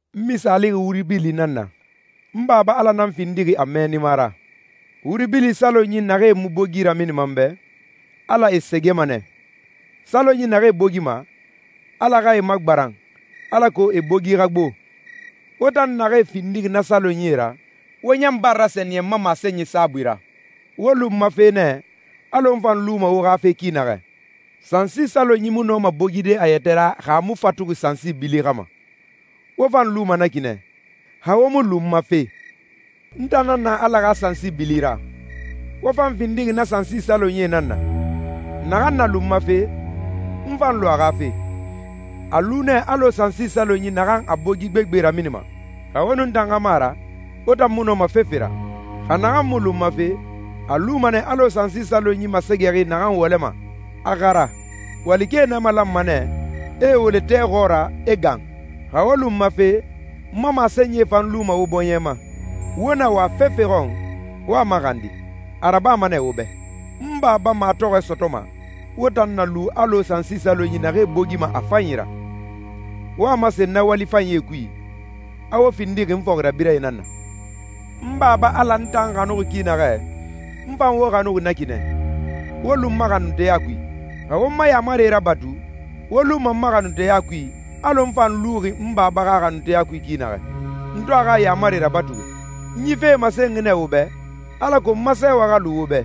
«N misaalixi wuri bili nan na, n Baba Ala nan findixi a mɛɛnima ra. Wuri bili salonyi naxee mu bogi raminima n bɛ, Ala e sɛgɛma nɛ. Salonyi naxee bogima, Ala xa e magbaran, alako e bogi xa gbo. Wo tan naxee findixi na salonyie ra, wo ɲan bara rasɛniyɛn n ma masenyi saabui ra. Wo lu n ma fe nɛ, alɔ n fan luma wo xa fe ki naxɛ. Sansi salonyi mu nɔma bogide a yɛtɛ ra xa a mu fatuxi sansi bili xa ma. Wo fan luma na ki nɛ, xa wo mu lu n ma fe. N tan nan na Ala xa sansi bili ra, wo fan findixi na sansi salonyie nan na. Naxan na lu n ma fe, n fan lu a xa fe, a lu nɛ alɔ sansi salonyi naxan a bogi gbegbe raminima. Xa wo nun n tan xa mu a ra, wo tan mu nɔma fefe ra. Xa naxan mu lu n ma fe, a luma nɛ alɔ sansi salonyi masɛgɛxi naxan wɔlɛma, a xara. Walikɛe nee malanma nɛ, e e wɔlɛ tɛ xɔɔra, e gan. Xa wo lu n ma fe, n ma masenyie fan lu wo bɔɲɛ ma, wo na wa fefe xɔn, wo a maxandi. A rabama nɛ wo bɛ. N Baba matɔxɔɛ sɔtɔma, wo tan na lu alɔ sansi salonyi naxee bogima a fanyi ra, wo a masen na wali fanyie kui, a wo findixi n fɔxirabirɛe nan na. N Baba Ala n tan xanuxi ki naxɛ, n fan wo xanuxi na ki nɛ. Wo lu n ma xanunteya kui. Xa wo n ma yaamarie rabatu, wo luma n ma xanunteya kui, alɔ n fan luxi n Baba xa xanunteya kui ki naxɛ, n to a xa yaamarie rabatuxi.» «N yi fee masenxi nɛ wo bɛ, alako n ma sɛɛwɛ xa lu wo bɛ,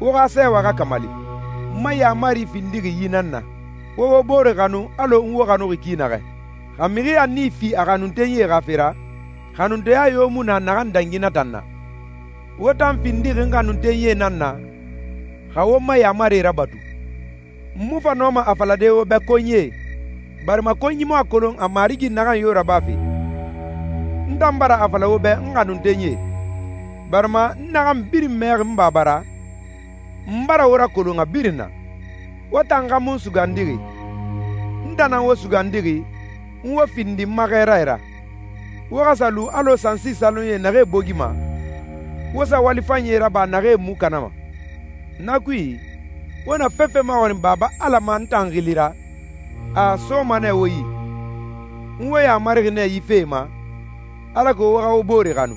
wo xa sɛɛwɛ xa kamali.» «N ma yaamari findixi yi nan na: Wo wo bore xanu alɔ n wo xanuxi ki naxɛ. Xa mixi a nii fi a xanuntenyie xa fe ra, xanunteya yo mu na naxan dangi na tan na. Wo tan findixi n xanuntenyie nan na, xa wo n ma yaamarie rabatu. N mu fa nɔma a falade wo bɛ ‹konyie›, barima konyi mu a kolon a marigi naxan yo rabafe. N tan bara a fala wo bɛ ‹n xanuntenyie›, barima n naxan birin mɛxi n Baba ra, n bara wo rakolon a birin na. Wo tan xa mu n sugandi. N tan nan wo sugandi, n wo findi n ma xɛɛrae ra, wo xa sa lu alɔ sansi salonyie naxee bogima, wo sa wali fanyie raba naxee mu kanama. Na kui, wo na fefe maxɔrin Baba Ala ma n tan xili ra, a a soma nɛ wo yi. N wo yamarixi nɛ yi fee ma, alako wo xa wo bore xanu.»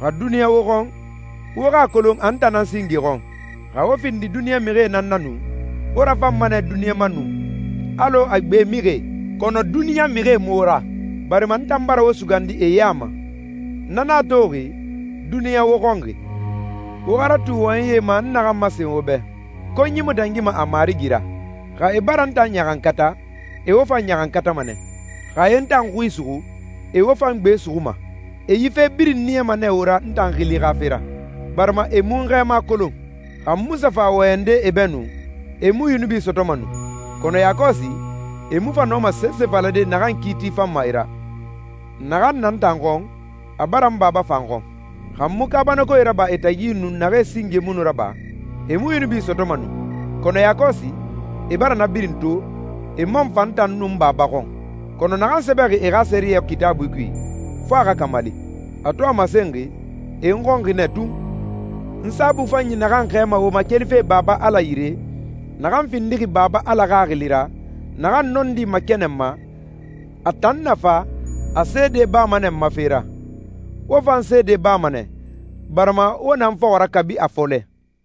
«Xa duniɲa wo xɔn, wo xa a kolon a n tan nan singe xɔn. Xa wo findi duniɲa mixie nan na nu, wo rafanma nɛ duniɲa ma nu, alɔ a gbe mixie. Kɔnɔ duniɲa mixie mu wo ra, barima n tan bara wo sugandi e ya ma. Na nan a toxi, duniɲa wo xɔnxi. Wo xa ratu wɔyɛnyi ma n naxan masen wo bɛ, ‹Konyi mu dangima a marigi ra.› Xa e bara n tan ɲaxankata, e wo fan ɲaxankatama nɛ. Xa e n tan xui suxu, e wo fan gbe suxuma. E yi fe birin niyama nɛ wo ra n tan xili xa fe ra, barima e mu n Xɛɛma kolon. Xa n mu sa fa wɔyɛnde e bɛ nu, e mu yunubi sɔtɔma nu. Kɔnɔ yakɔsi, e mu fa nɔma sese falade naxan kiiti fanma e ra. Naxan na n tan xɔn, a bara n Baba fan xɔn. Xa n mu kaabanakoe raba e tagi nu naxee singe mu nu raba, e mu yunubi sɔtɔma nu. Kɔnɔ yakɔsi, e bara na birin to, e man fa n tan nun n Baba xɔn. Kɔnɔ naxan sɛbɛxi e xa sɛriyɛ Kitaabui kui, fo a xa kamali, a to a masenxi, ‹E n xɔnxi nɛ tun.›» «N Saabui Fanyi naxan xɛɛma wo ma kelife Baba Ala yire, naxan findixi Baba Ala Xaxili ra, naxan nɔndi makɛnɛnma, a tan na fa, a seede bama nɛ n ma fe ra. Wo fan seede bama nɛ, barima wo na n fɔxɔ ra kabi a fɔlɛ.»